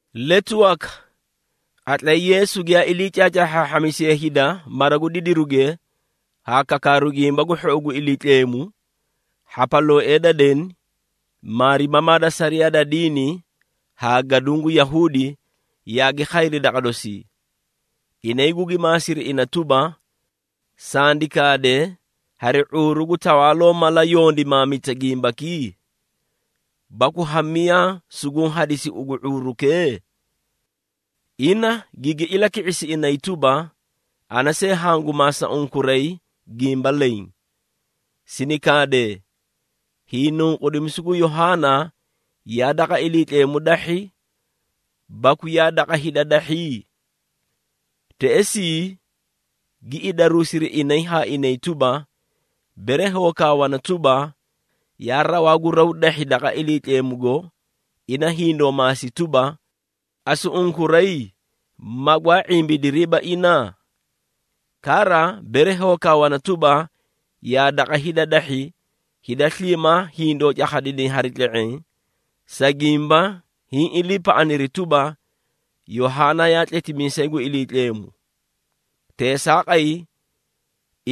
Letu waka, qatlay Yeesu giyaa ilii caacaahhaahhamisiye hida mara gu didiruge haa kakaaru Gimba gu Hhou gu Iliitleemu, hhapalooee da deni, maarimamaa da sariyaa da diini haa gaduũ gu Yahuudi, yaagi khayri daqa dosii. Inay gugi maasiri ina tuba, “Sandi kaade, hari ⁄uuru gu tawaaloo mala yondimaamita gimbaki? Baku ha miyaa suguũ hadisi ugu ⁄uurukee?” Ina gigi ilaki⁄isi inay tuba, “Ana see hangu maasa unkuray gimba leẽ. Sini kaadee, hiinunqudimisu gu Yohaana yaa daqa Iliitleemu dahhi, baku yaa daqa hida dahhi?” Teꞌesii, gi idaruusiri inay haa inay tuba, “Bere hoo kaawana tuba, yaa rawaa gu raw dahhi daqa Iliitleemugo, ina hindoo maasi tuba, ‘Asu unkuray magwaa ⁄imbidiriiba ina?’ Kara, bere hoo kaawana tuba, ‘Yaa daqa hida dahhi,’ hida sliimaa hindoo cakhadinay hari tle⁄eẽ, sa gimba hiĩ iliipaꞌaniri tuba, Yohaana yaa tletimiisay gu Iliitleemu.” Teesaaqay,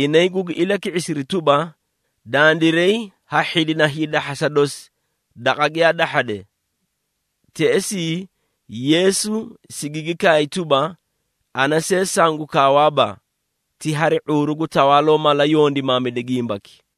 inay gugi ilaki⁄isiri tuba, “Dandiray ha hhidina hiidahhasa dosi, daqa giyaa dahhade.” Teꞌesii, Yeesu sigigi kaay tuba, “Ana see sangu kaawaaba, ti hari ⁄uuru gu tawaaloo mala yondimaamida gimbaki.”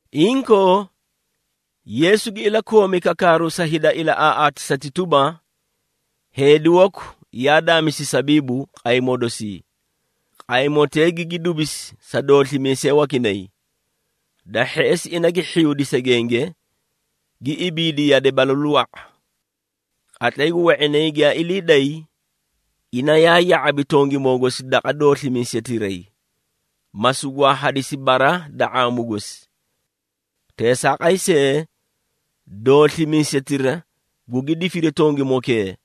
Inkoo, Yeesu gi ilakoomi kakaaru sa hida ilaꞌaaꞌaatisati tuba, “Heedi waku yaa daamisi sabiibu qaymoo dosii. Qaymotee gigi dubisi sa dooslimiisee wakinay. Da hheꞌesi, ina gi hhiyuudi segenge, gi ibiidi yade balalu wa⁄a. Qatlay gu we⁄inay giyaa ilii day, ina yaa ya⁄abi tongimoo gosi daqa dooslimiisetiray, ma sugwaa hadisi bara da ⁄aamu gosi. Teesaaqay see, dooslimiisetira gugi difiri tongimokee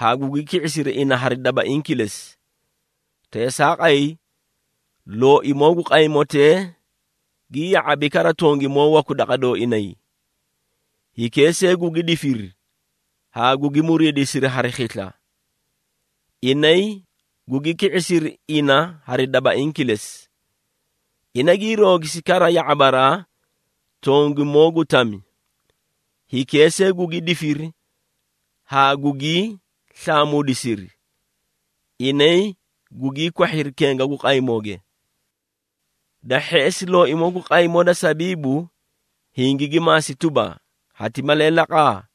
haa gugi ki⁄isiri ina hari dabaiĩ kilesi. Teesaaqay, looimoo gu qaymotee gi ya⁄abi kara tongimoo waku daqa dooinay. Hikee see gugi difiri haa gugi muriidisiri hari khisla. Inay gugi ki⁄isiri ina hari dabaiĩ kilesi. Ina gii roogisi kara ya⁄abaraa tongimoo gu tami. Hikee see gugi difiri haa gugii slaamuudisiri, inay gugii kwahhiri kenga gu qaymooge. Da hheꞌesi, looimoo gu qaymoo da sabiibu hingigi maasi tuba, ‘Hati malee laqa?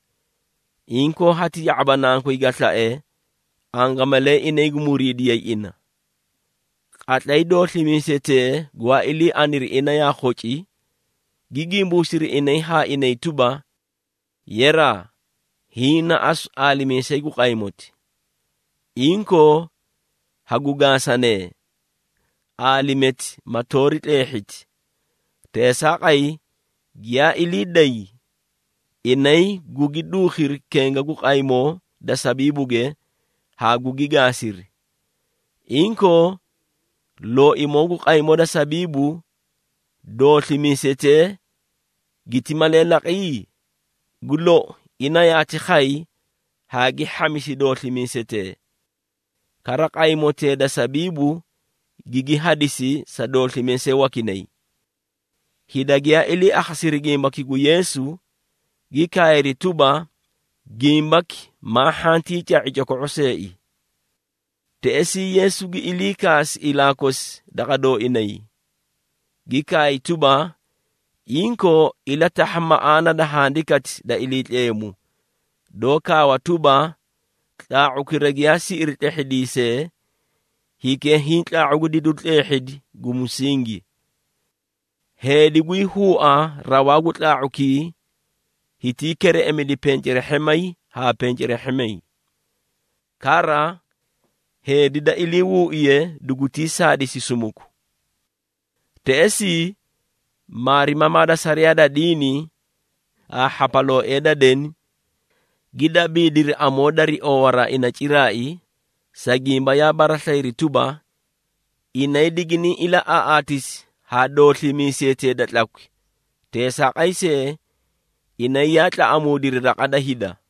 Inkoo hati ya⁄aba nankoy ga slae, angamalee inay gu muriidiyay ina.’ Qatlay dooslimiisetee gwaa ilii aniri ina yaa khoci, gi gimbuusiri inay haa inay tuba, ‘Yeraa, hiĩ na asu aalimiisayi gu qaymoti. Inkoo, hagu gaasanee, aalimeeti ma toori tleehhiti.’ Teesaaqay, giyaa ilii day inay gugi duukhiri kenga gu qaymoo da sabiibuge haa gugi gaasiri. Inkoo, looimoo gu qaymoo da sabiibu, dooslimiisetee giti malee laqi? Gu lou, ina yaati khay haa gi hhamisi dooslimiisetee. Kara qaymotee da sabiibu gigi hadisi sa dooslimiisee wakinay!” Hida giyaa ilii akhasiri gimbaki gu Yeesu, gi kaayri tuba, “Gimbaki maa hhantii ca⁄i coko⁄o seei!” Teꞌesii, Yeesu gi ilii kaasi ilaa kosi daqa dooinay, gi kaay tuba, “Inkoo, ilatahha maꞌaana da Handikati da Iliitleemu, doó kaawa tuba, ‘Tlaa⁄ukira giyaa siꞌiri tlehhidiisee, hikee hiĩ tlaa⁄u gu didiru tleehhidi gu musingi!’ Heedi gwii huua rawaa gu tlaa⁄ukii hitii kereꞌemidi pencerehhemay haa pencerehhemay. Kara heedi da iliihuuiye dugutii saadisi sumuku.” Teꞌesii, maarimamaa da sariyaa da diini haa hhapalooee da deni, gi dabiidiri amoo dari oowaraa ina ciraai, sa gimba yaa baraslayiri tuba, inay diginiĩ ilaꞌaaꞌaatisi haa dooslimiisetee da tlakwi. Teesaaqay see, inay yaa tlaꞌamuudiri raqa da hida.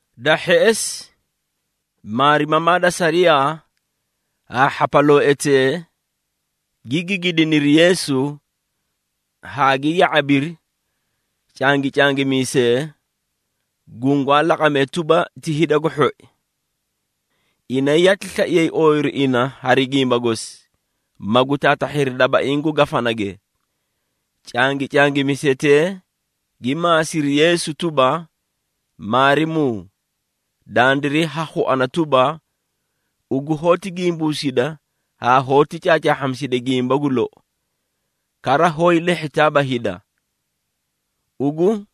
Da hheꞌesi, maarimamaa da sariyaa haa hhapalooetee gi gigidiniri Yeesu haa gi ya⁄abiri cangincangimisee, gungwaa laqamee tuba ti hida gu hhoi. Inay yaati slaiyay ooyiru ina hari gimba gosi, magu taatahhiri dabaiĩ gu gafanage. Cangicangimisetee gi maasiri Yeesu tuba, “Maarimuu, dandiray ha khuana tuba, ugu hoóti gimbuusida haa hoóti caacaahhamisida gimba gu lou, kara hoó hiilehhitaaba hida. Ugu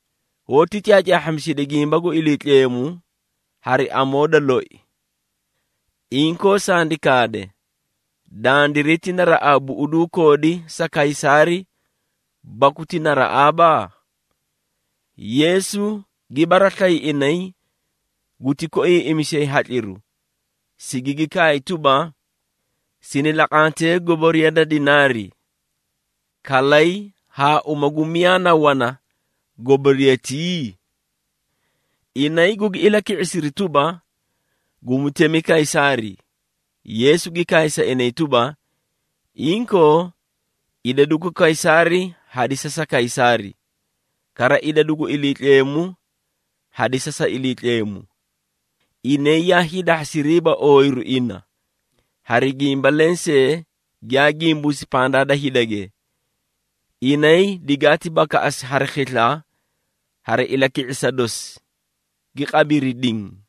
hoóti caacaahhamisida gimba gu Iliitleemu hari amoo da loi. Inkoo sandi kaade, dandiray ti naraꞌaa buꞌuduu koodi sa Kaysaari baku ti naraꞌaaba?” Yeesu gi baraslayi inay guti koiiꞌimisiyay hatliru, sigigi kaay tuba, “Sini laqantee goboriya da dinaari. Kalay haa uma gu miyaa na wana goboriyatii?” Inay gugi ilaki⁄isiri tuba, “Gu mutemi Kaysaari.” Yeesu gi kaay sa inay tuba, “Inkoo! Idadu gu Kaysaari hadisa sa Kaysaari, kara idadu gu Iliitleemu hadisa sa Iliitleemu.” Inay yaa hiidahhasiriiba ooyiru ina, hari gimba lensee giyaa gimbuusi pandaa da hidage. Inay digaati bakaꞌasi hari khisla hari ilaki⁄isa dosi, gi qabiri diĩ.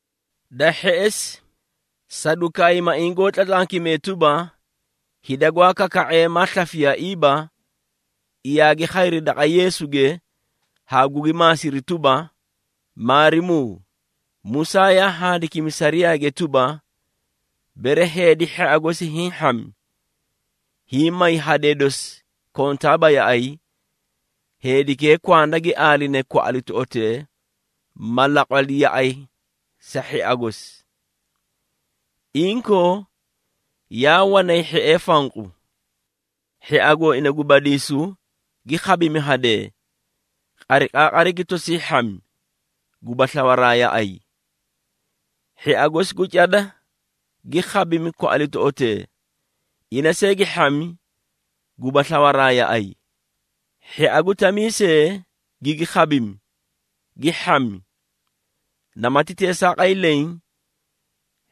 Da hheꞌesi, Sadukaayimaiĩ goó tlatlankimee tuba, hida gwaa kaka⁄ee, maa slafiyaaiiba, yaagi khayri daqa Yeesuge haa gugi maasiri tuba, “Maarimuu, Musaa yaa handikimi sariyaage tuba, bere heedi hhia gosi hiĩ hhami, hiĩ may hadee dosi kontaaba yaꞌay, heedikee kwanda gi aaline kwaꞌalitoꞌotee, ma laqwali yaꞌay sa hhia gosi. Inkoo, yaa wanay hhiee fanqu. Hhia gooina gu badiisu gi khabimi hadee, qariqaaqari gi tosii hhami, guba slawaraa yaꞌay. Hhia gosi gu cada gi khabimi kwaꞌalitoꞌotee, ina see gi hhami guba slawaraa yaꞌay. Hhia gu tamii see gigi khabimi, gi hhami. Namati teesaaqay leẽ,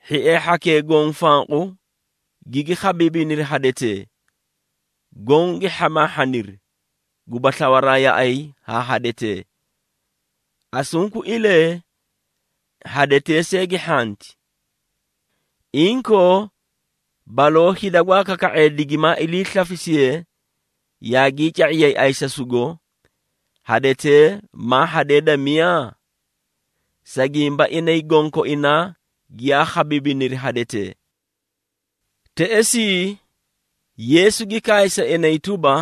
hhiee hhakee goõ fanqu gigi khabiibiniri hadetee, goõ gi hhamaahhaniri, guba slawaraa yaꞌay haa hadetee. Asunkuilee, hadetee see gi hhanti. Inkoo, baloo hida gwaa kaka⁄ee digimaa iliislafisiye yaagii ca⁄iyay ayisasugo, hadetee maa hadee da miyaa? Sa gimba inay gonkoinaa giyaa khabiibiniri hadetee.” Teꞌesii, Yeesu gi kaay sa inay tuba,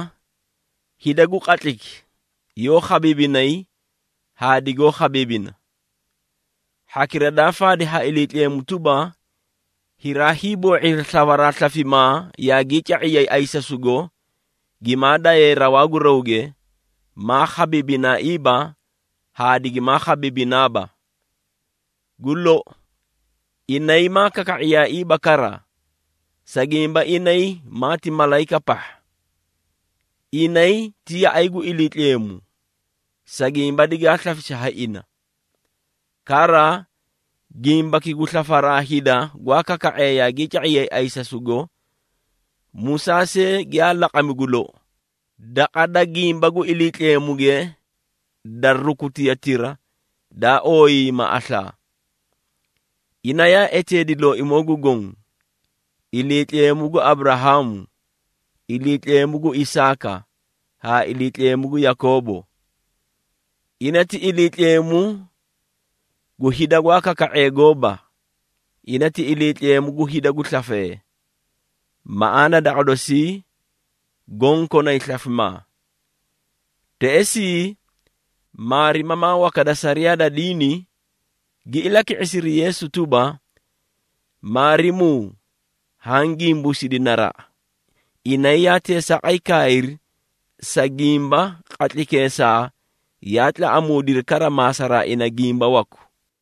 “Hida gu qatlayki yoó khabiibinay haa digoó khabiibina. Hhakira daa faadi ha Iliitleemu tuba, hiraa hiiboo⁄iri slawaraa slafimaa yaagii ca⁄iyay ayisasugo gimaa dayee rawaa gu rawge, maa khabiibinaaiiba haa digimaa khabiibinaaba. Gu lou, inay maa kaka⁄iyaaiiba kara, sa gimba inay maati malayika pahha. Inay ti yaꞌay gu Iliitleemu, sa gimba digaa slafisi ha ina. Kara, gimbaki gu slafaraa hida gwaa kaka⁄ee yaagii ca⁄iyay ayisasugo, Musaa see giyaa laqami gu lou, daqa da gimba gu Iliitleemuge da rukutiyatira daa ooyiiyima aslaa. Ina yaa eteedi Looimoo gu Goõ, ‘Iliitleemu gu Aburahaamu, Iliitleemu gu Isaaka haa Iliitleemu gu Yakoobo.’ Ina ti Iliitleemu gu hida gwaa kaka⁄ee gooba. Ina, ti Iliitleemu gu hida gu slafee, maꞌaana daqa dosii goõ konay slafimaa.” Teꞌesii, maarimamaa waka da sariyaa da diini, gi ilaki⁄isiri Yeesu tuba, “Maarimuu haã gimbuusidi naraꞌa!” Inay yaa teesaaqay kaayri, sa gimba qatlaykeesaa yaa tlaꞌamuudiri kara maasaraa ina gimba waku.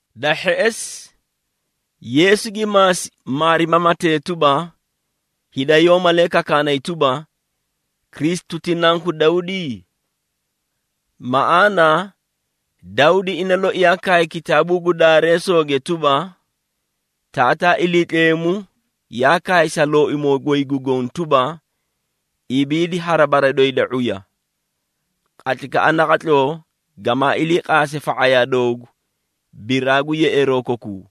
Da hheꞌesi, Yeesu gi maasi maarimamatee tuba, “Hida yoó malee kakaanay tuba, Kristu ti Nanku Dawdi? Maꞌaana, Dawdi ina loi yaa kaay kitaabuu gu Daareesooge tuba, Taataa Iliitleemu yaa kaay sa Looimoo goy gu Goõ tuba, ‘Ibiidi hari bara doyi da ⁄uya, qatlaykaꞌa naqatloo gamaa ilii qaase fa⁄ayaa doogu, biraa gu yeꞌeeroo kokuu.’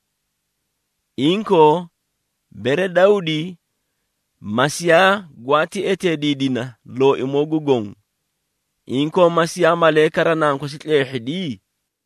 Inkoo, bere Dawdi, Masiiya gwaati eteediidina, ‘Looimoo gu Goõ.’ Inkoo Masiiya malee kara nankosi tleehhidi?”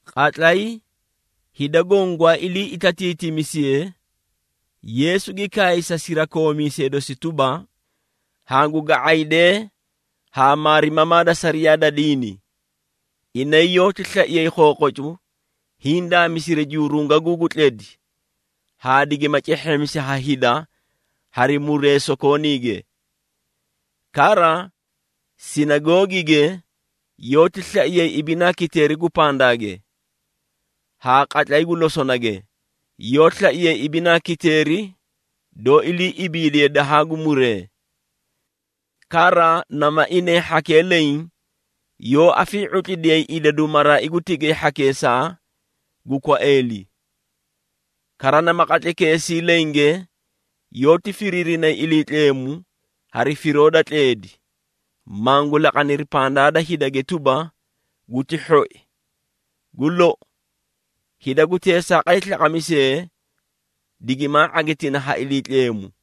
Qatlay hida goõ gwaa ilii itatiitimisiyee, Yeesu gi kaay sa sirakoomiisee dosi tuba, “Hangu ga⁄aydee haa maarimamaa da sariyaa da diini. Inay yoóti slaiyay khookhocu hiĩ daamisiri jurungaguu gu tledi haa digima cehheemisi ha hida hari muree sokooniige. Kara sinagoogige yoóti slaiyay ibinaa kiteeri gu pandaage, haa qatlay gu losonage, yoó slaiyay ibinaa kiteeri doó ilii ibiidiye dahaa gu muree. Kara nama inay hhakee leẽ yoó afii⁄utlidiyayi idadu maraai gu tigay hhakeesaa gu kwaeeli. Kara nama qatlaykeesii lenge, yoóti firiirinay Iliitleemu hari firoo da tleedi, mangu laqaniri pandaa da hidage tuba, guti hhoi. Gu lou, hida gu teesaaqay slaqamisee digimaa ⁄agitina ha Iliitleemu.”